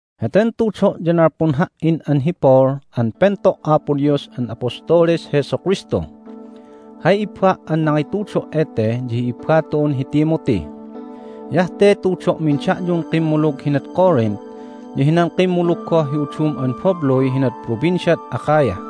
Heten tudo' ya nalpun ha"in an hi Paul an pento' Apo Dios an apostoles Jesu Kristu. Hay ibba' an nangitudo' ete ya hi ibba tu'un hi Timothy. Hiyah te tudo'min da'yun kimmulug hinad Corinth ya hinan kimmulug goh hi udum an babluy hinah Provinciad Achaia.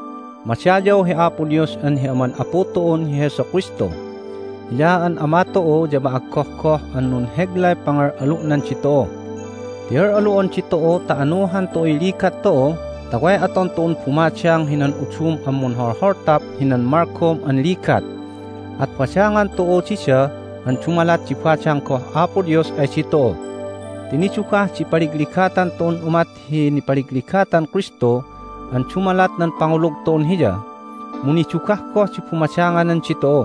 Madayaw hi Apo Dios an hi Aman Apu tu'un hi Jesu Kristu. Hiya an Ama tu'u ya ma'aggohgoh an nunheglay pangal'alu'nan ditu'u. Ti al'alu'on ditu'u ta anuhan tu'uy ligat tu'u ta way aton tu'un bumadang hinan udum an munholholtap hinan malgom an ligat. At badangan tu'u dida an dumalat di badang goh Apo Dios ay ditu'u. Ti nidugah di ipaligligatan tu'un umat hi nipaligligatan Kristu an dumalat nan pangulug tu'un Hiya, mu nidugah goh di bumadanganan ditu'u.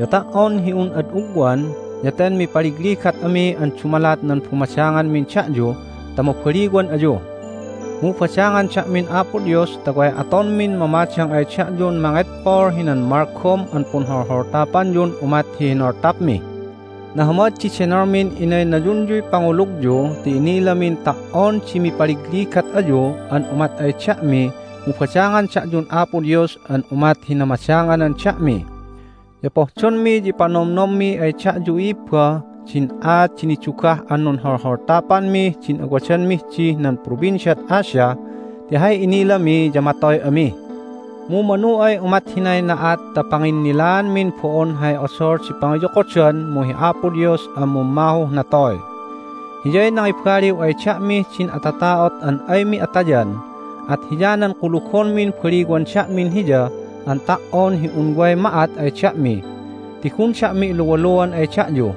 Ya ta"on hi un ad ugwan ya ten mipaligligat ami an dumalat nan bumadanganmin da'yu ta mabaliwan ayu. Mu badangan da'min Apo Dios ta way atonmin mamadang ay da'yun mangedpol hinan malgom an punholholtapanyun umat hi hinoltapmi. Nahamad di denolmin inaynayunyuy pangulugyu ti inilamin ta"on di mipaligligat ayu an umat ay da'mi mu badangan da'yun Apo Dios an umat hi namadanganan da'mi. Ya pohdonmi ya ipanomnommi ay da'yu, i'ibba, din aat di nidugah an nunholtapanmih din awadanmih dih nan Provinciad Asia ti hay inilami ya matoy ami. Mu manu ay umat hinay na'at ta panginnilaanmin bo'on hay odol di pangiyokodan mu hi Apo Dios an mummahuh natoy. Hiyay nangibaliw ay da'mih din atata'ot an aymi atayan, at hiyanan kulugonmin baliwan da'min Hiya an ta"on hi un way ma'at ay da'mi ti gun da'mi iluwaluan ay da'yu.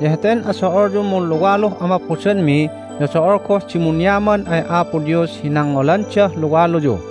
Ya heten ado'olyun munluwaluh amaphodanmi ya do'ol goh di munyaman ay Apo Dios hi nangngolandah luwaluyu.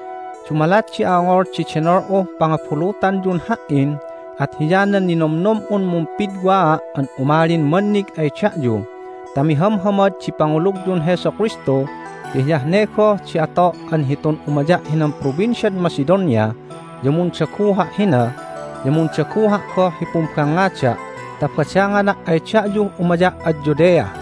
Dumalat di a'ongol di denol'uh pangabulutanyun ha"in at hiyanan ninomnom'un mumpidwaa' an umalin mannig ay da'yu ta mihamhamad di pangulugyun Jesu Kristu ti hiyah ne goh di ato' an hitun umaya' hinan Provinciad Macedonia ya mundaguha' hina, ya mundaguha' goh hi pumbangngada' ta badangana' ay da'yuh umaya' ad Judea.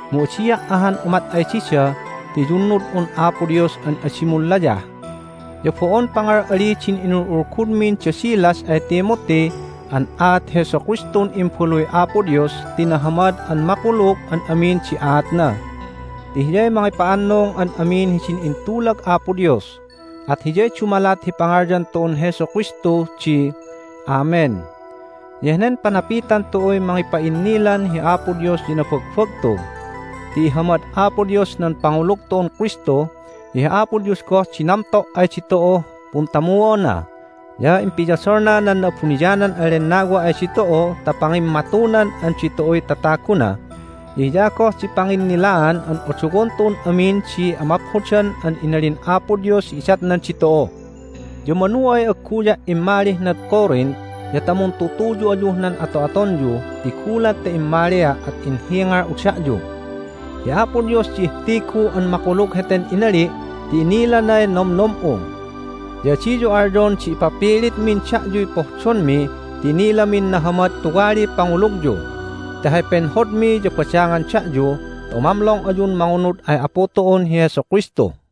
Mu adia' ahan umat ay dida ti iyunnud'un Apo Dios an adi munlayah! Ya bo'on pangal'ali din inul'ulgudmin da Silas ay Timothy an aat Jesu Kristun Imbaluy Apo Dios ti nahamad an makulug an amin di aatna ti Hiyay mangipa'annung an amin hidin intulag Apo Dios. At hiyay dumalat hi pangalyan tu'un Jesu Kristu di, "Amen," ya henen panapitan tu'uy mangipa'innilan hi Apo Dios ya nabagbagtu. Ti ihamad Apo Dios nan pangulug tu'un Kristu, ya hi Apo Dios goh di namto' ay ditu'uh puntamuona, ya impiyodolna nan Na'abuniyanan an Lennawa ay ditu'u ta pangimmatunan an ditu'uy tataguna, ya hiya goh di panginnilaan an odowon tu'un amin di amaphodan an inalin Apo Dios hi idatnan ditu'u. Ya manu ay agguya' immalih nad Corinth ya ta muntutuyu ayuh nan ato'atonyu ti gulat ta immalia' at inhingal'u da'yu. Hi Apo Dios di ihtigu an makulug heten inali' ti inilanay nomnom'u. Ya adiyu alyon di ipapilitmin da'yuy pohdonmi ti inilamin nahamad tuwaliy pangulugyu. Ti hay penhodmi ya badangan da'yu ta umamlong ayun mangunud ay Apu tu'un hi Jesu Kristu.